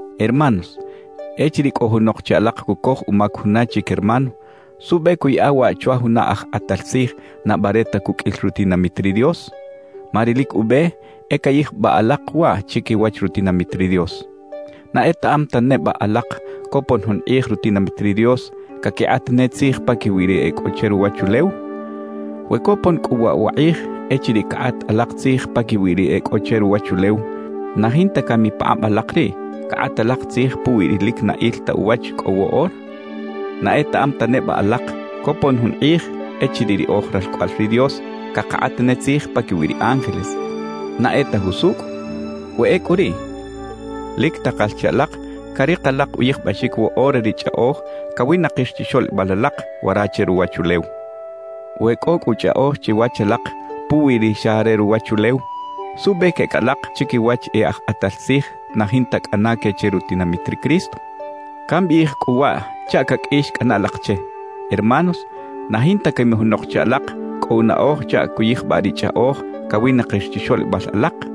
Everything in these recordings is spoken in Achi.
Hermanos, echiriꞌ cꞌo junok che alak cucoj umac juna chic hermano, ¿suꞌbe cuꞌyaꞌa waꞌ chwa juna aj kꞌatal tzij na bare ta cuqꞌuil rutinamit ri Dios? Ma ri lic ube e cayijbaꞌ alak waꞌ chiquiwach rutinamit ri Dios. ¿Na etaꞌam ta neba alak copon jun kꞌij rutinamit ri Dios caquikꞌat ne tzij paquiwi ri e cꞌo che ruwachulew? We copon cꞌu waꞌ wa kꞌij echiriꞌ cakꞌat alak tzij paquiwi ri e cꞌo che ruwachulew, ¿na jinta cami pakꞌab alak riꞌ cakꞌat alak tzij puwi ri lic na il ta uwach cꞌo woꞌora? ¿Na etaꞌam ta neba alak copon jun kꞌij echiriꞌ ri oj ralcꞌoꞌal ri Dios cakakꞌat ne tzij paquiwi ri ángeles na e ta jusucꞌ? We ecꞌu riꞌ, lic takal che alak carik alak uyijbaxic woꞌora ri chꞌaꞌoj cawinakir chixoꞌlibal alak wara che ruwachulew. We cꞌo cꞌu chꞌaꞌoj chiwach alak puwi ri xa re ruwachulew, ¿suꞌbe queꞌec alak chiquiwach e aj kꞌatal tzij na jinta cꞌana que che rutinamit ri Cristo? Cambiꞌij cꞌu waꞌ chaꞌ caqꞌuix cꞌana alak che. Hermanos, ¿na jinta cami junok che alak cꞌo unaꞌoj chaꞌ cuyijbaꞌ ri chꞌaꞌoj cawinakir chixoꞌlibal alak?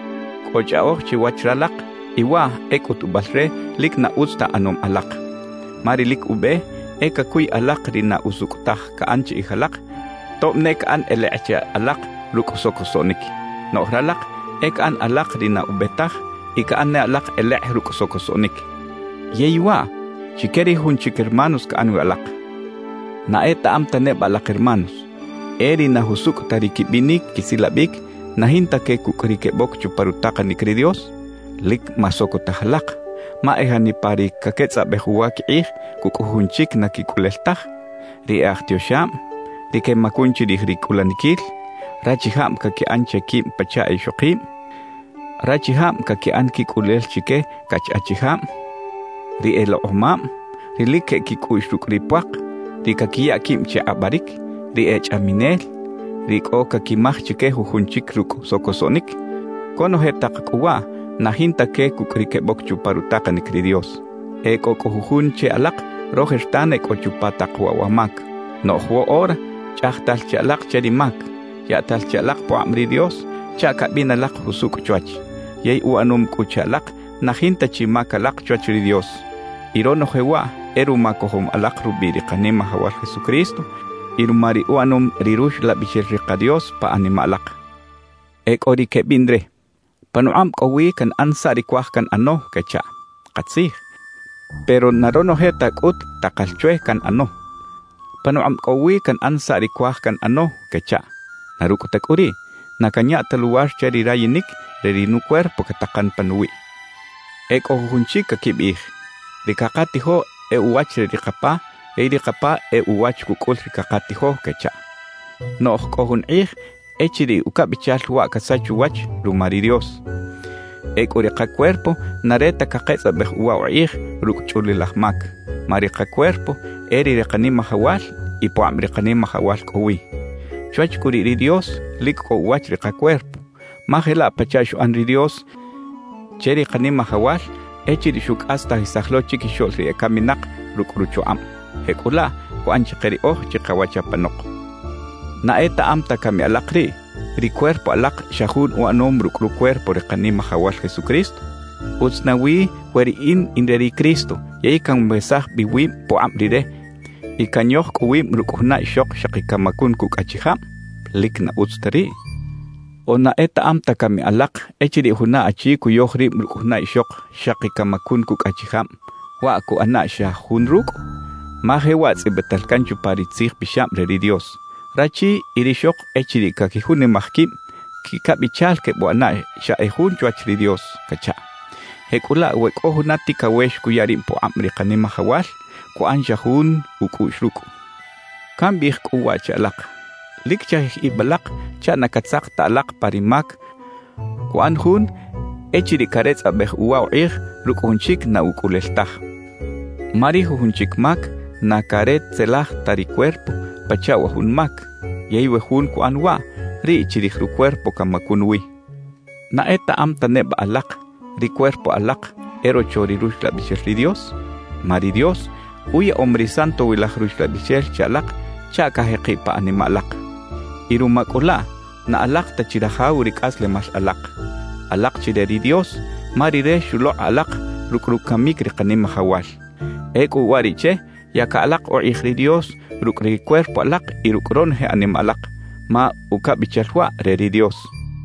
Cꞌo chꞌaꞌoj chiwach ralak y waꞌ e cꞌutubal re lic na utz ta ꞌanom alak. Ma ri lic ube e cacuy alak ri na usucꞌ taj caꞌan chiꞌij alak tob ne caꞌan elekꞌ che alak rucꞌ socosoꞌnic. Noꞌj ralak e caꞌan alak ri na ube taj y caꞌan ne alak elekꞌ rucꞌ socosoꞌnic, ¡yey waꞌ chique ri jujun chic hermanos caꞌan wi alak! ¿Na etaꞌam ta neba alak hermanos, e ri na jusucꞌ ta ri quibinic quisilabic na jinta que cucꞌ ri queboc chupa rutakanic ri Dios? Lic masocotaj alak; ma e janipa ri caquetzꞌabej uwa quikꞌij cucꞌ jujun chic na quicꞌulel taj, ri e aj tioxab, ri quemacun chirij ri cꞌulaniquil, rachijab caquiꞌan che quib pachaꞌ e ixokib, rachijab caquiꞌan quicꞌulel chique cach achijab, ri elekꞌomab, ri lic queꞌec quicꞌuꞌx rucꞌ ri puak, ri caquiya quib che kꞌabaric, ri e chꞌaminel, ri cꞌo caquimaj chique jujun chic rucꞌ socosoꞌnic; conoje tak cꞌu waꞌ na jinta que cucꞌ ri queboc chupa rutakanic ri Dios. E cꞌo cꞌu jujun che alak rojertan e cꞌo chupa tak waꞌ wa mac. Noꞌj woꞌora chꞌajtal chi alak che ri mac, yaꞌtal chi alak pukꞌab ri Dios chaꞌ cabin alak jusucꞌ chwach, yey uꞌanom cꞌu che alak na jinta chi mac alak chwach ri Dios. Y ronoje waꞌ e ruma cojom alak rubiꞌ ri Kanimajawal Jesucristo y ruma ri uꞌanom ri Ruxlabixel ri ka Dios pa animaꞌ alak. E cꞌo ri quebiꞌn re: «Panukꞌab cꞌo wi canꞌan saꞌ ri cuaj canꞌano» quechaꞌ. Katzij, pero na ronoje ta cꞌut takal chwe canꞌano. «Panukꞌab cꞌo wi canꞌan saꞌ ri cuaj canꞌano» quechaꞌ. Na rucꞌ ta cꞌu riꞌ, na canya ta luwar che ri rayinic re ri nucuerpo catakan panuwiꞌ. E cꞌo jujun chic caquibiꞌij: «Ri cakatijo e uwach re ri kapa yey ri kapa e uwach cucꞌul ri cakatijo» quechaꞌ. Noꞌj cꞌo jun kꞌij echiriꞌ ucabichal waꞌ casach uwach ruma ri Dios. Ecꞌu ri kacuerpo na re ta caketzꞌabej uwa ukꞌij rucꞌ chꞌulilaj mac, ma ri kacuerpo e re ri Kanimajawal y pukꞌab ri Kanimajawal cꞌo wi. Chwach cꞌu riꞌ ri Dios, lic cꞌo uwach ri kacuerpo. Ma jelaꞌ pachaꞌ xuꞌan ri Dios che ri Kanimajawal echiriꞌ xucꞌastajisaj lo chiquixoꞌl ri ecaminak rucꞌ ruchukꞌab, jecꞌulaꞌ cuꞌan chike riꞌoj chikawach apanok. ¿Na etaꞌam ta cami alak riꞌ, ri cuerpo alak xa jun uꞌanom rucꞌ rucuerpo ri Kanimajawal Jesucristo? ¿Utz nawi we riꞌin in re ri Cristo yey canwesaj bi wib pukꞌab Rire y canyoj cꞌu wib rucꞌ juna ixok xaki camacun cucꞌ achijab? ¡Lic na utz ta riꞌ! ¿O na etaꞌam ta cami alak echiriꞌ juna achi cuyoj rib rucꞌ juna ixok xaki camacun cucꞌ achijab, waꞌ cuꞌana xa jun rucꞌ? Ma jewaꞌ tzꞌibital can chupa ri Tzij Pixab re ri Dios: Rachi y rixok echiriꞌ caquijunimaj quib, «quicabichal quebuꞌana xa e jun chwach ri Dios» cachaꞌ. Jecꞌulaꞌ we cꞌo juna ticawex cuya rib pukꞌab ri Kanimajawal, cuꞌan xa jun ucꞌuꞌx rucꞌ. Cambiꞌij cꞌu waꞌ che alak: Lic chajij ib alak chaꞌ na catzak ta alak pa ri mac cuꞌan jun echiriꞌ caretzꞌabej uwa ukꞌij rucꞌ jun chic na ucꞌulel taj. Ma ri jujun chic mac na caretzelaj ta ri cuerpo pachaꞌ wa jun mac, yey we jun cuꞌan waꞌ, riꞌ chirij rucuerpo camacun wi. ¿Na etaꞌam ta neba alak, ri cuerpo alak e rocho ri Ruxlabixel ri Dios? Ma ri Dios uyaꞌom ri Santowilaj Ruxlabixel che alak chaꞌ cajekiꞌ pa animaꞌ alak. Y ruma cꞌu laꞌ, na alak ta chi rajaw ri cꞌaslemal alak. Alak chi re ri Dios, ma Rire xulokꞌ alak rucꞌ rucamic ri Kanimajawal. Ecꞌu uwariꞌche, yaca alak ukꞌij ri Dios rucꞌ ri cuerpo alak y rucꞌ ronoje animaꞌ alak, ma ucabichal waꞌ, re ri Dios.